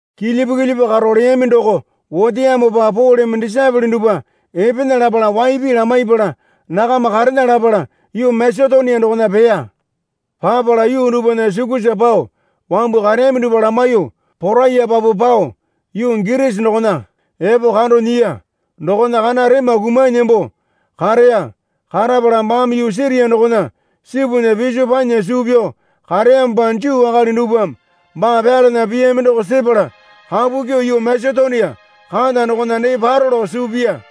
Kilyipu kilyipu karo leyami doko oteyamopa Poleme disaepole dupwa epena lapala waipi lamaipala nakama karena lapala yuu Masetonia dokona peya. Papala yuu dupwana sukusa pao wambu kareyami dupwa lamaiyuo poraiyepapu pao yuu Girisi dokona epo kando nyiya. Dokona kana rema kumanyi nembo kareya. Karapala baame yuu Siria dokona sipunya piso panya suu pyao kareyamopa Juu akali dupwame baa pyalana piyami doko sepala kapu kyuo yuu Masetonia kata dokona dee paro lao suu piya.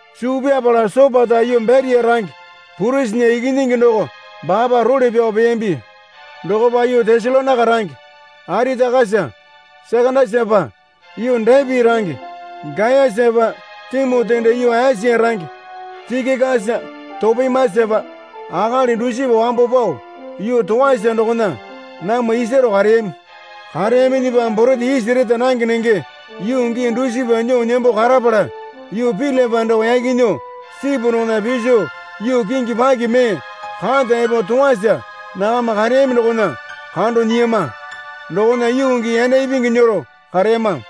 Suu pyapala Sopata yuu Beria range Pirusinya ikinyingi doko baapa role pyao peyambi. Dokopa yuu Tesalonaika range Aritakasa Sekandasapa, yuu Depi range Gayasapa, Timoti dee yuu Esia range Tikikasa Topimasapa akali dusipa wambo pao yuu Toasa dokona namwa isaro kareyami. Kareyaminyipa borete isi reta nange nenge yuu gii dusipa nyuo nembo karapala yuu Pilipai doko yaki nyuo sipu dokona piso yuu kingi paki mee kata epo Toasa nakama kareyami dokona kando nyiyama. Dokona yuu gii yanda ipingi nyero kareyama.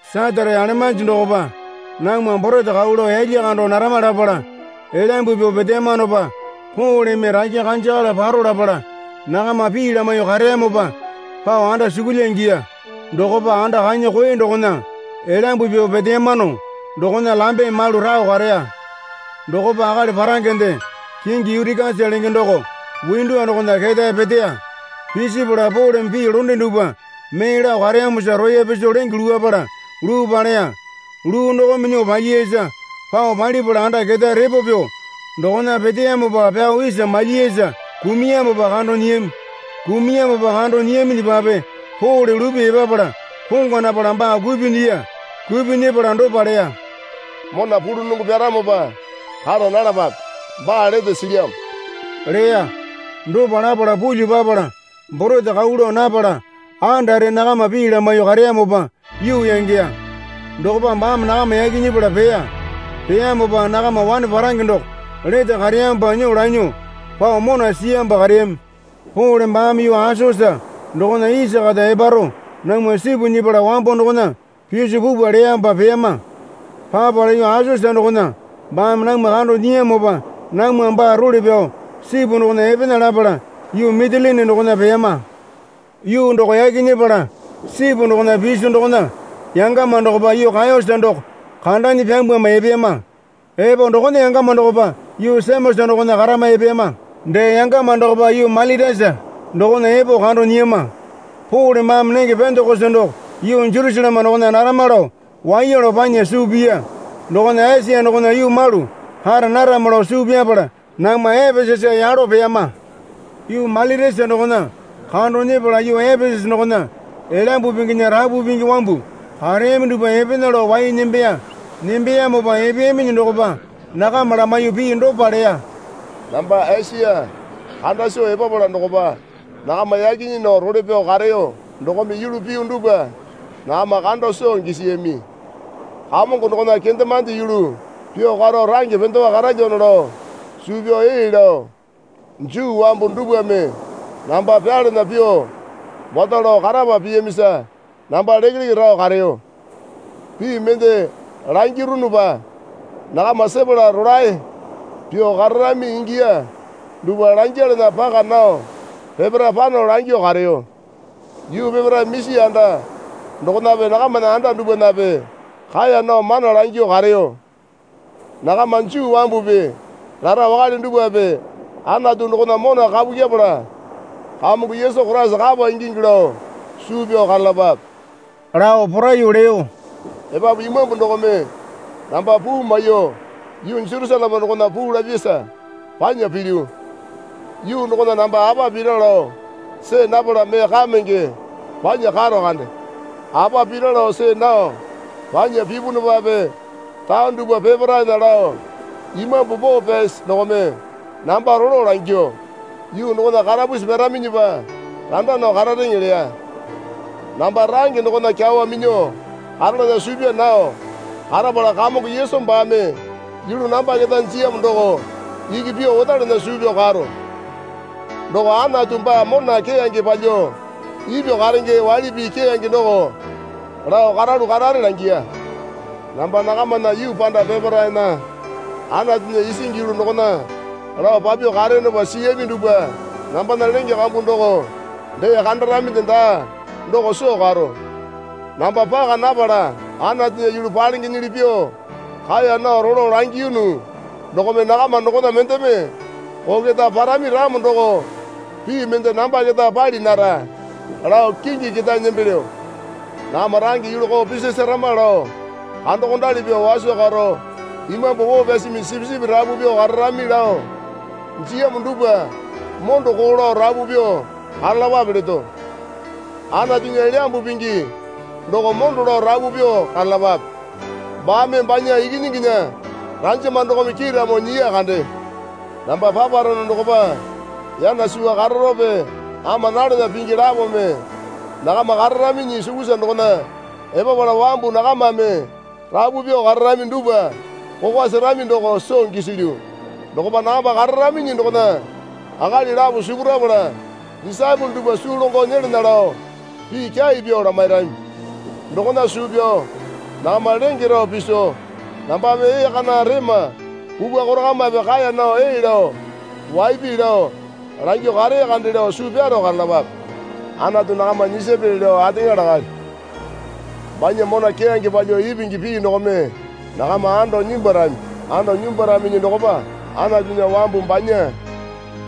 Satate alemanji dokopa namwa borete kau lao yalya kando narama lapala elaymbu pyuo peteyamanopa Poleme rakya kanjakala paro lapala nakama pii lamaiyuo kareyamopa pao andasukulya ingiya. Dokopa anda kanya koe dokona elyambu pyuo peteyamano dokona lambe malu rao kareya. Dokopa akali parangende kingi Yutikasa lenge doko windowa dokona ketae peteya. Pisipala Poleme pii londe dupwa mee lao kareyamosa roya piso lenge luwapala luu paleya. Luu dokome nyuo palyiyasa pao palipala anda ketae repo pyuo dokona peteyamopa pyao isa malyiyasa kumuyamopa kando nyiyami. Kumuyamopa kando nyiyaminyipape Pole lupyuo epapala pongwa napala baa kupyuo nyiya. Kupyuo nyepala dopa leya. Mona pulunongo pyaramopa kara nalapape. Baa lete silyamo leya. Dopa lapala pulyuo papala borete kau lao napala andare nakama pii lamaiyuo kareyamopa yuu yangeya. Dokopa baame nakama yaki nyepala peya. Peyamopa nakama wane parange doko lete kareyamopa nyuo lanyuo pao mona siyamopa kareyami. Pole baame yuu Asosa dokona isa kata eparo namwa sipu nyepala wambo dokona piso pupwa leyamopa peyama. Papala yuu Asosa dokona baame namwa kando nyiyamopa namwame baa role pyao sipu dokona epena lapala yuu Mitilini dokona peyama. Yuu doko yaki nyepala sipu dokona piso dokona yangama dokopa yuu Kayosa doko kandanyi pyambwama epeyama. Epo dokona yangama dokopa yuu Semosa dokona karama epeyama. Dee yangama dokopa yuu Mailitasa dokona epo kando nyiyama. Pole baame nenge Pendekosa doko yuu Jerusaleme dokona narama lao waiya lao panya suu piya. Dokona Esia dokona yuu malu kara narama lao suu pyapala namwa Epesasa yalo peyama. Yuu Mailitasa dokona kando nyepala yuu Epesasa dokona Elyambu Pinginya rapu pingi wambu kareyami dupwa epena lao wai nembeya. Nembeyamopa epeyaminyi dokopa nakama lamaiyuo pii dopa leya. Namba Esia kanda soo epapala dokopa nakama yaki nyii nao role pyao kareyo dokome yulu piyu dupwa nakama kando soo gisiyami. Kamongo dokona kendemande yulu pyuo karo range pendewa karalyano lao suu pyao ee lao Juu wambu dupwame namba pyalana pyuo wato lao karapu piyamisa namba lekeleke rao kareyo. Pii mende langirunupa nakama sepala rolae pyuo kararami ingiya dupwa langyalana paka nao peparae pano langyuo kareyo. Yuu peparae misi anda dokonape nakamana anda dupwanape kaeya nao mana langyuo kareyo. Nakama Juu wambupi rara wakale dupwape Anatu dokona mona kapu kyepala Kamongo Yesu Koraisa kapa ingingi lao suu pyao karalapape lao poraiyuo leyo. Epapu Imambu dokome namba puu maiyuo yuu Jerusaleme dokona puu lapyasa panya pilyu. Yuu dokona namba apa pira lao see napala mee kamenge panya karo kande. Apa pira lao see nao panya pipunupape taone dupwa peparaena lao Imambu Poo Pyasi dokome namba rolo langyuo, Yuu dokona karapusi pyaraminyipa randa nao karareŋe leya. Namba range dokona kyawa minyuo karalana suu pyaa nao karapala Kamongo Yesu baame yulu namba keta jiyamo doko iki pyuo otalana suu pyao karo. Doko Anatu baa mona keyange palyuo ipyuo karenge waili pii keyange doko lao karalu karare langiya. Namba nakamana yuu panda peparaena Anatunya isingi yulu dokona lao papyuo kareyonopa siyami dupwa nambana lenge kambu doko dee kandaraminde daa doko soo karo. Namba paka napala Anatunya yulu palengenyili pyuo kaeya nao rolo langiyunu dokome nakama dokona mendeme koo keta parami ramo doko pii mende namba keta pali nara lao kingi ketae nembelyo. Nakama range yulu koo pisasarama lao kandokondali pyuo waso karo Imambu Poo Pyasimi sipisipi rapu pyuo kararami lao jiyamo dupwa mondo koo lao rapu pyuo karalapape leto. Anatunya Elyambu Pingi doko mondo lao rapu pyuo karalapape. Baame banya Ikinyinginya ranjama dokome kiiramo nyiya kande. Namba paparono dokopa yana suwa kararope ama nalana pingi lapome nakama kararaminyi sukusa dokona epapala wambu nakamame rapu pyuo kararami dupwa kokwa serami doko soo gisilyu. Dokopa nakama kararaminyi dokona akali lapo sipurapala disaepole dupwa suu longo nyelana lao pii kyai pyuo lamairami. Dokona suu pyao nakama lenge rao piso nambame ee kana rema kukwa korakamape kaeya nao ee lao waipi lao langyuo karee kande lao suu pyaro karalapape. Anatu nakama nyisapyali lao ateŋa lakalyo. Banya mona keyange palyuo ipingi pii dokome nakama ando nyimbwarami. Ando nyimbwaraminyi dokopa Anatunya wambu banya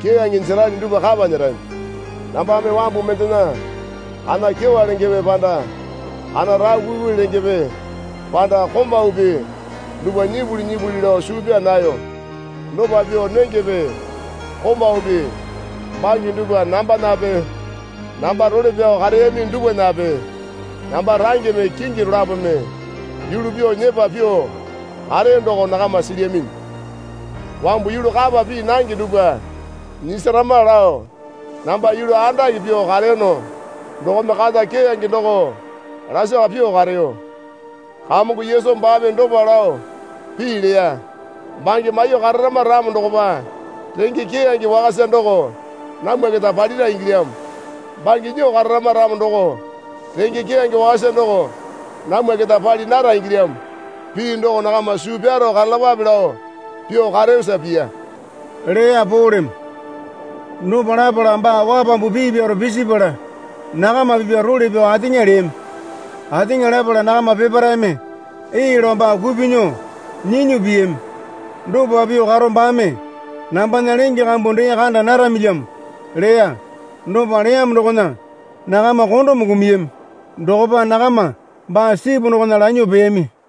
keyange jerali dupwa kapa nyerami. Nambame wambu mendena kana kyewa lengepe panda kana rao kuikui lengepe panda komaupi dupwa nyipuli nyipuli lao suu pyaa nayo. Dopa pyuo nengepe komaupi bange dupwa nambanape namba role pyao kareyami dupwanape namba rangeme kingi dolapome yulu pyuo nyepa pyuo kareyo doko nakama silyaminyi. Wambu yulu kapa pii nange dupwa nyisarama lao namba yulu andake pyuo kareyono dokome kata keyange doko lasaka pyuo kareyo. Kamongo Yesu baame dopa lao pii leya. Bange maiyuo kararama ramo dokopa renge keyange wakasa doko namwa keta palira ingilyamo. Bange nyuo kararama ramo doko renge keyange wakasa doko namwa keta pali nara ingilyamo. Pii doko nakama suu pyaro karalapape lao pyuo kareyosa piya, leya Poleme. Dopa lapala baa wapambu pii pyaro pisipala nakama pipya role pyao ateŋa leyami. Ateŋa lapala nakama peparaeme ee lao baa kupyuo nyuo nyinyi piyami. Dopa pyuo karo baame, Nambana lenge kambu dee kanda naramilyamo leya. Dopa leyamo dokona nakama kondome kumuyami. Dokopa nakama baa sipu dokona lanyuo peyami.